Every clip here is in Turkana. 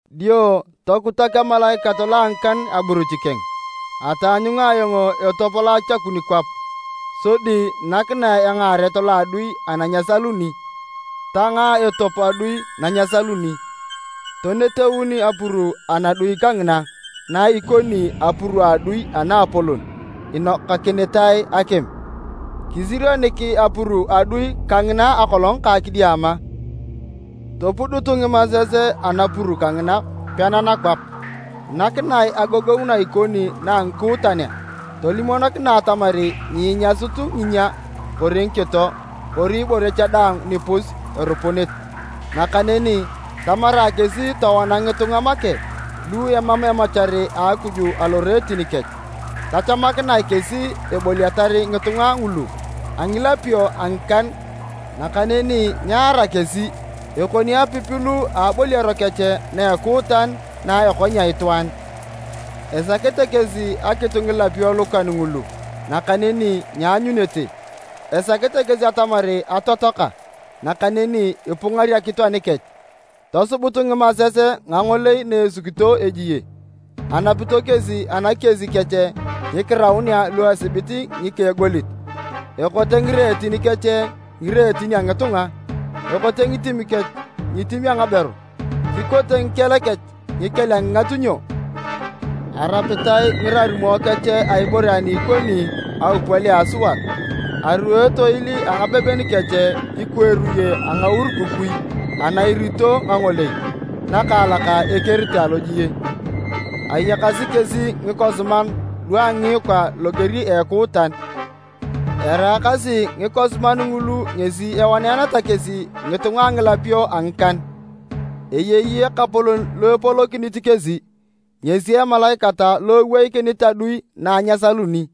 Dio tokutak emalaikat lo a ngikan aburuch keng. Ataanyunga ayong etop lo achakun kwap, sodi nakinae engaaret lo a adui ana nyesaluni. Tangaa etop adui na nyesaluni, toneteun apuru anadui kangina na ikoni apuru a adui anaapolon inokakinitae akim. Kisirionik apuru a adui kangina akolong ka kidiama. Topudut ngimases anapuru kangina pena nakwap, nakinae agogongu na ikoni na a ngikuutanea. Tolimokinae atamar nyiinyasut nginyia kori ngikito, kori ibore cha daang nipus erupunit. Nakaneni tamarae kesi towana ngitunga make lu emam emachar a Akuj aloreetin kech. Tachamakinae kesi eboliatar ngitunga ngulu a ngilapio a ngikan, nakaneni nyear kesi. Ekoni apipilu a aboliaro kech na a ekuutan na ekonyea itwaan. Esakete kesi akitu ngilapio lukan ngulu nakaneni nyeanyunete, esakete kesi atamar atotoaka nakaneni ipungar akitu anikech. Tosubut ngimases ngangolei na esukito ejie. Anapito kesi anakies kech ngikiraunea lu esibit ngika a egolit, ekote ngireetin kech ngireetin a ngitunga. Ekote ngitim kech ngitim a ngaberu, kikote ngikel kech ngikel a ngingatunyo. Arapitae ngirarumo kech a ibore ani ikoni aupwal a asuat. Aruo etoil a ngabeben kech ikwa eruye a ngaurukukui ana irito ngangolei nakaalak ekerete alojie. Ayakasi kesi ngikosiman lu a ngiikwa loger a ekuutan, eraakasi ngikosiman ngulu ngesi ewaneeneta kesi ngitunga a ngilapio a ngikan. Eyei ekapolon lo epolokinit kesi, ngesi emalaikat lo eweikinit adui na nyesaluni.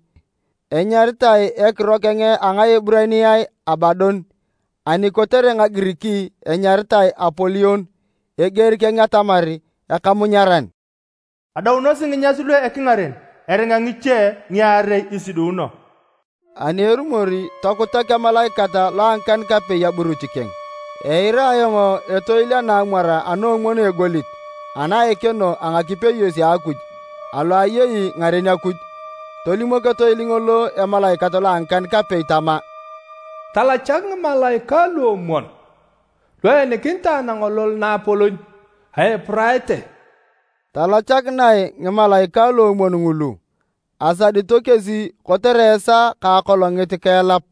Enyaritae ekiro keng a Ngaeburaniae Abadon, ani kotere Ngagirik enyaritae Apolion, (eger keng atamar, “Ekamunyaran”). Adaunosi nginyas lu ekingaren, eringa ngiche ngiarei isidiuno. Ani erumor tokutak emalaikat lo a ngikan-kapei aburuch keng. Eira ayong etoil anaamwar anaomwon a egolit ana a ekeno a ngakipeyos a Akuj, alo ayei ngaren Akuj. Tolimok etoil ngolo emalaikat lo a ngikan-kapei tama, “Talachak ngimalaikae luomwon lu eenikinitae nangolol naapolon a Eupurate!” Talachakinae ngimalaikae luomwon ngulu. Asadito kesi kotere esaa ka akolongit ka elap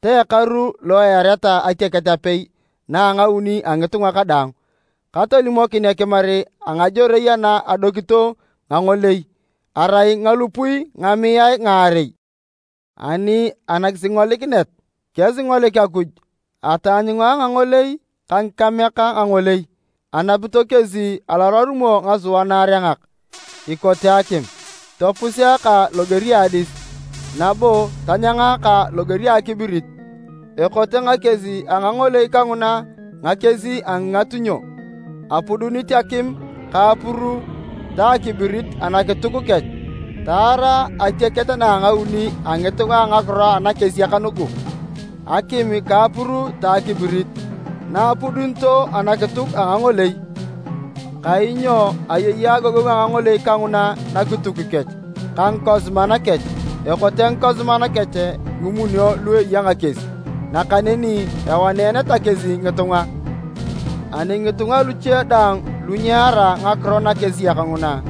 ta ekaru lo eareta atiaket apei ana a ngauni a ngitunga kadaang. Katolimokin ekimar a ngajorei ana adokito ngangolei: arai ngalupui ngamiae ngaarei. Ani anakisingolikinet kesingolikini Akuj, ataanyunga ngangolei ka ngikameak ngangolei. Anapito kesi alorarumo ngasua naarengak ikote akim, topuseaka loger a adis, nabo tanyangaka loger a akibirit. Ekote ngakies a ngangolei kanguna ngakies a ngingatunyo. Apudunit akim ka apuru ta akibirit anakituk kech. Taara atiaket na a ngauni a ngitunga ngakiro nakesiak nugu, akim ka apuru ta akibirit, na apudunito anakituk a ngangolei. Kainyo ayei agogongu a ngangolei kanguna nakituk kech ka ngikosiman kech. Ekote ngikosiman kech ngimunio lu eya ngakies, nakaneni ewaneeneta kesi ngitunga. Ani ngitunga luche daang lu nyeara ngakiro nakesiak nguna,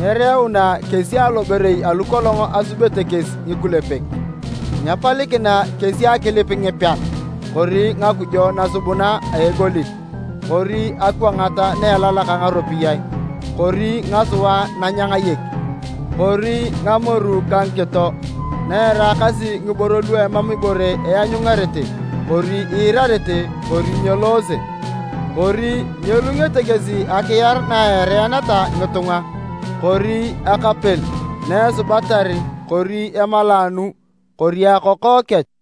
nyereuna kesi aloborei alu kolong asubete kesi ngikulepek. Nyepalikina kesi akilip ngipean, kori ngakujo nasubuna a egolit, kori akwangat na elalak ngaropiyae, kori ngasua nanyangayek, kori ngamoru ka ngakito, na eraakasi ngiboro lu emam ibore eanyungarete kori iirarete kori nyeloose. Kori nyelungete kesi akiar na eareeneta ngitunga kori akapel na esubatar kori emalaanu kori akoko kech.